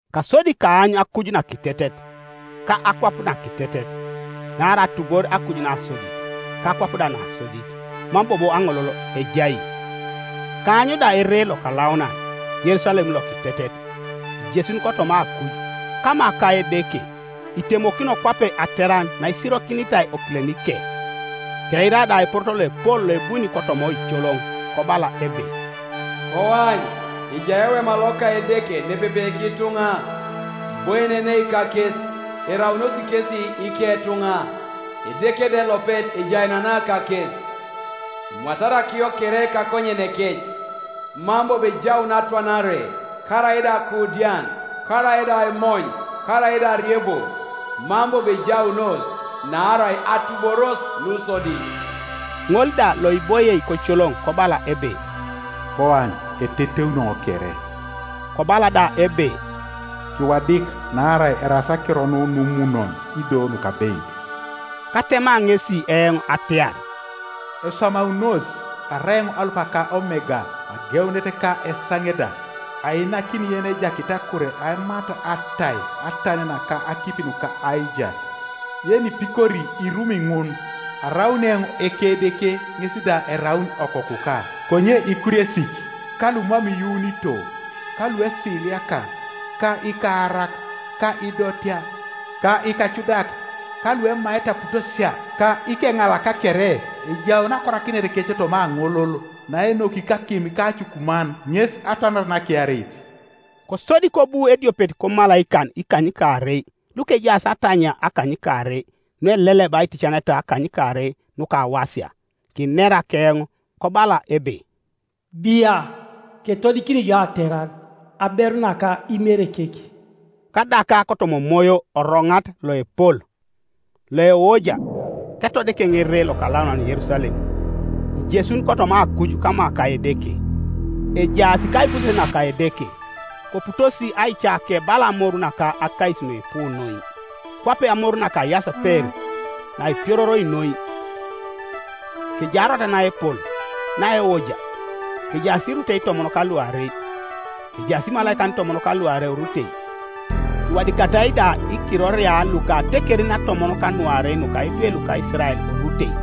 Kasodi kaany akuj nakitetet, ka akwap nakitetet; naarai atubor akuj nasodit, ka akwap da nasodit, mam bobo aŋolol ejai. Kaany da ere lokalaunan, Yerusalem lokitetet, ijesun kotoma akuj, kama ka Edeke, itemokino kwape ateran naisirokinitai okilenike. Keira da eporoto loepol loebuni kotoma oicoloŋ kobala ebe, “Koany, ejai ewema loka Edeke nepepe kituŋa, iboienenei kakes, eraunos kesi iketuŋa, Edeke da elopet ejaenena kakes. Emwatari akiyo kere kakonyeneke, mam bobo ejaun atwanare, karaida akuudian, karaida aimony, karaida ariebo, mam bobo ejaunos; naarai atuboros nusodit.” Ŋol da loiboie koicoloŋ kobala ebe, “Koany, eteteuni eoŋ kere.” Kobala da ebe, “Kiwadik, naarai eraas akiro nu numunon ido nukabeit.” Katema ŋesi eoŋ atiar, “Eswamaunos! Arai eoŋ Alupa ka Omega, ageunet ka esaŋe da, Ainakini yenejakit akure aimat atai atan naka akipi nuka aijar. Yenipikori irumi ŋun, araun eoŋ Ekedeke, ŋes da eraun okokuka. Konye ikuriesik, ka lumam iyuunito, ka luesiliaka, ka ikaarak, ka idotea, ka ikacudak, ka luemaete aputosia, ka ikeŋalak kere, ejaun akorakineteke toma aŋolol naenoki kakim ka acukuman; ŋes atwanare nakiareit.” Kosodi kobu ediopet komalaikan ikanykaarei lukejaas atanyia akanykaarei nueleleba aiticaneta akanykaarei nukawasia, kinera keoŋ, kobala ebe, “Bia, ketodikini jo ateran, aberu naka Imerekek.” Kadaka kotoma Omoyo oroŋat loepol, loeoja, ketodik eoŋ ere lokalaunan Yerusalem, ijesun kotoma akuj kama ka Edeke, ejaas kaibuses naka Edeke, koputosi aicake bala amoru naka akais nuipu noi, kwape amoru naka ayaseper naipiororoi noi. Kejai arwatat naepol, naeoja, kejaas irutei itomon ka luarei, kejaas imalaikan itomon ka luarei orutei, kiwadikatai da ikiroria luka atekerin atomon ka nuarei nuka idwe luka Isirael orutei.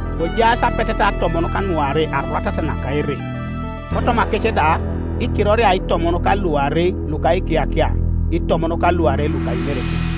Kojaas apeteta atomon ka nuarei arwatat naka ere, kotomakec da ikiroria itomon ka luarei luka ikiyakia itomon ka luarei luka Imerekek.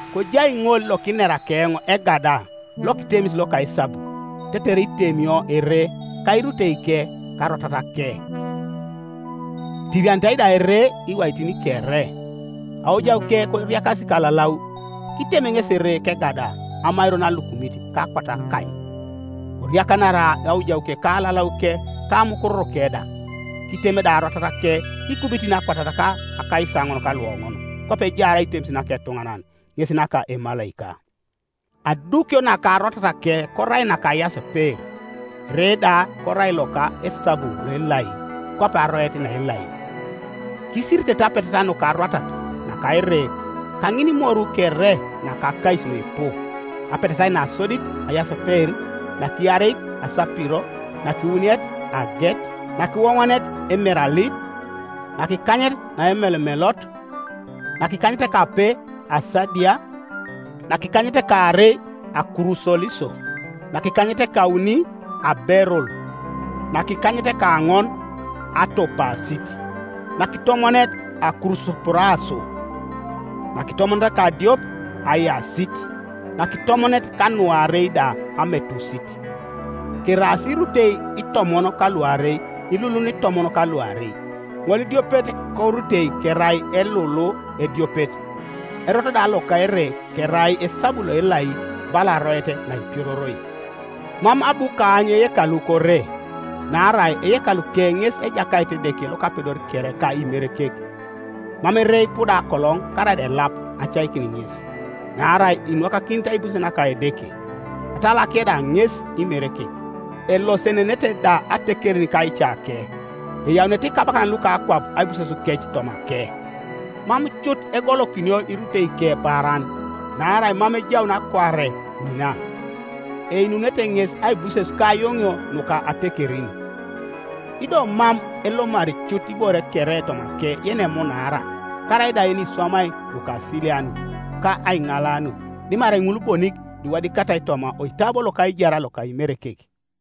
Kojai ŋol lokinera keoŋ egada lokitemis loka esabu, tetere itemio ere, ka iruteike, ka arwatatake. Etirianitai da ere iwaitin kere, aojauke koriakasi kalalau. Kitem ŋesi ere kegada amairon alukumit ka akwat akany; koriakanara aojauke ka alalauke ka amukururuke da. Kitem da arwatatake ikubitin akwatat ka akaisaoŋon ka luoŋon, kwape ejaar aitemis naka etuŋanan, ŋes naka emalaika. Adukio naka arwatatake korai naka ayaseper, ere da korai loka esabu loelai, kwape aroet naelai. Kisiritete apeteta nuka arwatat naka ere kaŋinimoru kere naka akais nuipu; apetetait nasodit ayaseper, nakiareit asapiro, nakiwuniet aget, nakiwoŋonet emeralid, nakikanyet naemelomelot; nakikanyetekape asadia; nakikanyetekaarei akurusoliso; nakikanyetekauni aberul; nakikanyetekaoŋon atopasit; nakitomonet akurusopuraso; nakitomonet ka nadiopet ayasit; nakitomonet kanuarei da ametusit, Keraas irutei itomon ka luarei ilulun itomon ka luarei, ŋolidiopet korutei kerai elulu ediopet; erot da loka ere kerai esabu loelai bala aroet naipiororoi. Mam abu kaany eyekalu kore, naarai eyekaluke ŋes Ejakait Edeke Lokapedor kere ka Imerekek. Mam ere ipuda akoloŋ karaida elap acaikin ŋes; naarai inwakakinit aibuses naka Edeke, atalake da ŋes Imerekek. Elosenenete da atekerin kaicake, eyaunete ikabakan luka akwap aibusesukec tomake; mam cut egolokinio iruteike paaran, naarai mam ejaun akuare ŋina; einunete ŋes aibuses ka ayoŋio nuka atekerin. Ido mam elomari cut ibore kere tomake yenemunaara, karaida yeniswamai nukasilianut, ka aiŋalanut, dimarai ŋul bonik luiwadikatai toma oitabo loka aijar loka Imerekek.